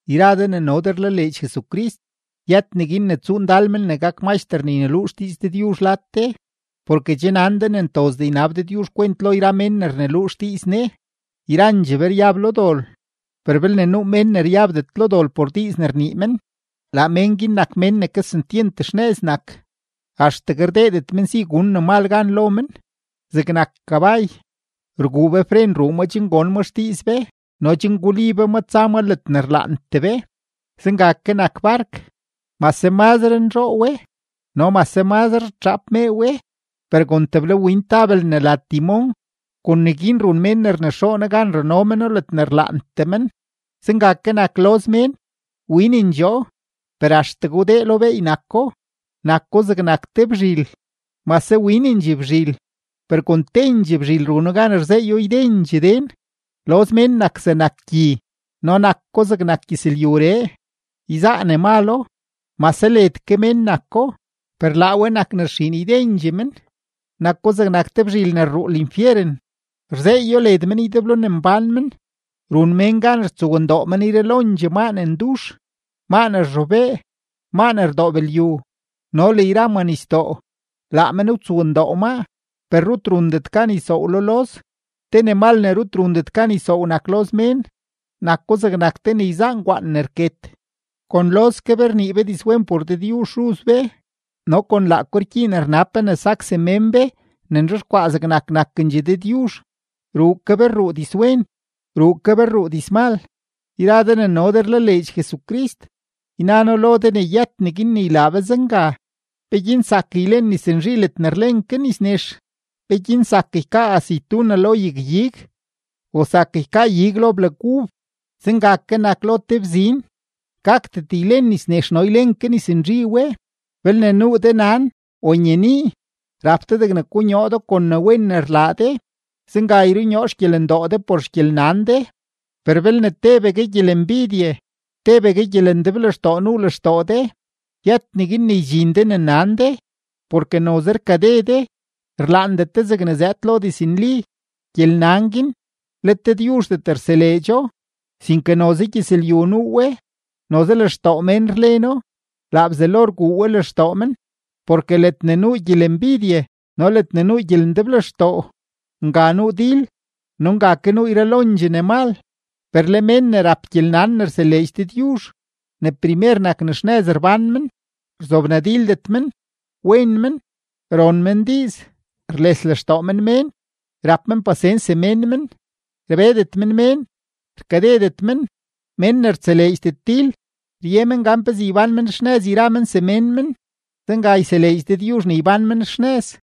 Yra de ne no de rlaleedx Jesucrist, yët neguin ne tsuu ndal men ne gak maxter ne yneluu xdiiz Dëdyuzh lad de, porke che nan de ne ntozdee ynab Dëdyuzh kwent lo yra mén ne rneluu xdiiz Ne. Yrandxee be ryab lo dol. Per belne nuu mén ne ryabdet lo dol por diiz ne rnii men, laa mén guin nak mén ne kesentyent xnëz nak, axtegue rdeedet men si gun ne mal gan lo men. Zegnak kabay, rguu be fren ruu maa chen gon ma xdiiz be no chen guli be ma tsa ma ledne rlaantee be. Zenga ke nak bark; mase mazre nzhoo we no mase mazre rtxaap mee we, per kon teblawin tabel ne la timón, kon neguin run mén ne rnexoono gan rano meno ledne rlaantee men. Zenga ke nak loz mén; winendxoo, per axtegue wdee lo beey nako, nako zegnak te bzhil; mase winendxee bzhil, per kon tendxee bzhil run gan rzeey ydendxee den. Loz mén nak zegnak gyi no nak ko zegnak gyëzlyuree, yzaa ne malo; mase led ke mén nako, per laa we nak ne rxiin ydendxee men; nako zegnak te bzhil ne rruu linfyeren, rzeeyo led men ydeblo ne mbán men. Run mén gan rtsowndoo men yralondxee maa ne ndux, maa ne rzhobee, maa ne rdoob lyu, no le yra manisdoo; laa men wtsowndoo maa. Per rut rundet gan ysoow lo loz. Te ne mal ne rut rundet gan ysoow nak loz mén; nako zegnak te ne yzaa ngwaan ne rket. Kon loz ke be rnii be dizwen por Dëdyuzh Xuz be, no kon laako rgyiin rnab be ne sak semén be ne nzhexkwaa zegnak nakendxee Dëdyuzh. Ruu ke be rruu dizwen, ruu ke be rruu dizmal. Yra de ne no de rlaleedx Jesucrist, yna noo lo de ne yët neguin ne ylaa be zenga. ¿Peguin zak ylen nis nzhi ledne rlen ke nis nex? ¿Peguin zak ykaa aceituna lo te yag-ig, o zak ykaa ig lo blag ub? Zenga ke nak te lo bzin, gakdet ylen nis nex no ylen ke nis nzhi we. Belne nuu de nan o nyenii, rap de degne konyoo do kon ne wen ne rlaa de; zenga yrunyoo xgyelendoo de por xgyelnan de. Per belne tebegue gyelembidye, tebegue gyelendeblextoo nuu lextoo de, yët neguin ne ydxin de ne nan de, porke noze rkade de; rlaandet de zegne zëëd lo diznli. Gyelnan guin, let Dëdyuzhdet rseleedxo, sinke noze gyëzlyu nuu we, noze lextoo mén rleno, laa Bzelo rguu we lextoo men. Porke ledne nuu gyelembidye no ledne nuu gyelendeblextoo, nga nuu dil no nga ke nuu yralondxee ne mal. Per le mén ne rap gyelnan ne rseleedx Dëdyuzh, ne primer nak ne xnëz rbán men, rzobnadildet men, wen men, ron men diiz, rles lextoo men mén, rap men pasens semén men, rbedet men mén, rkadedet men. Mén ne rtseleedxdet dil, rye men gan pezee ybán men xnëz yra men semén men. Zenga yseleedx Dëdyuzh ne ybán men xnëz.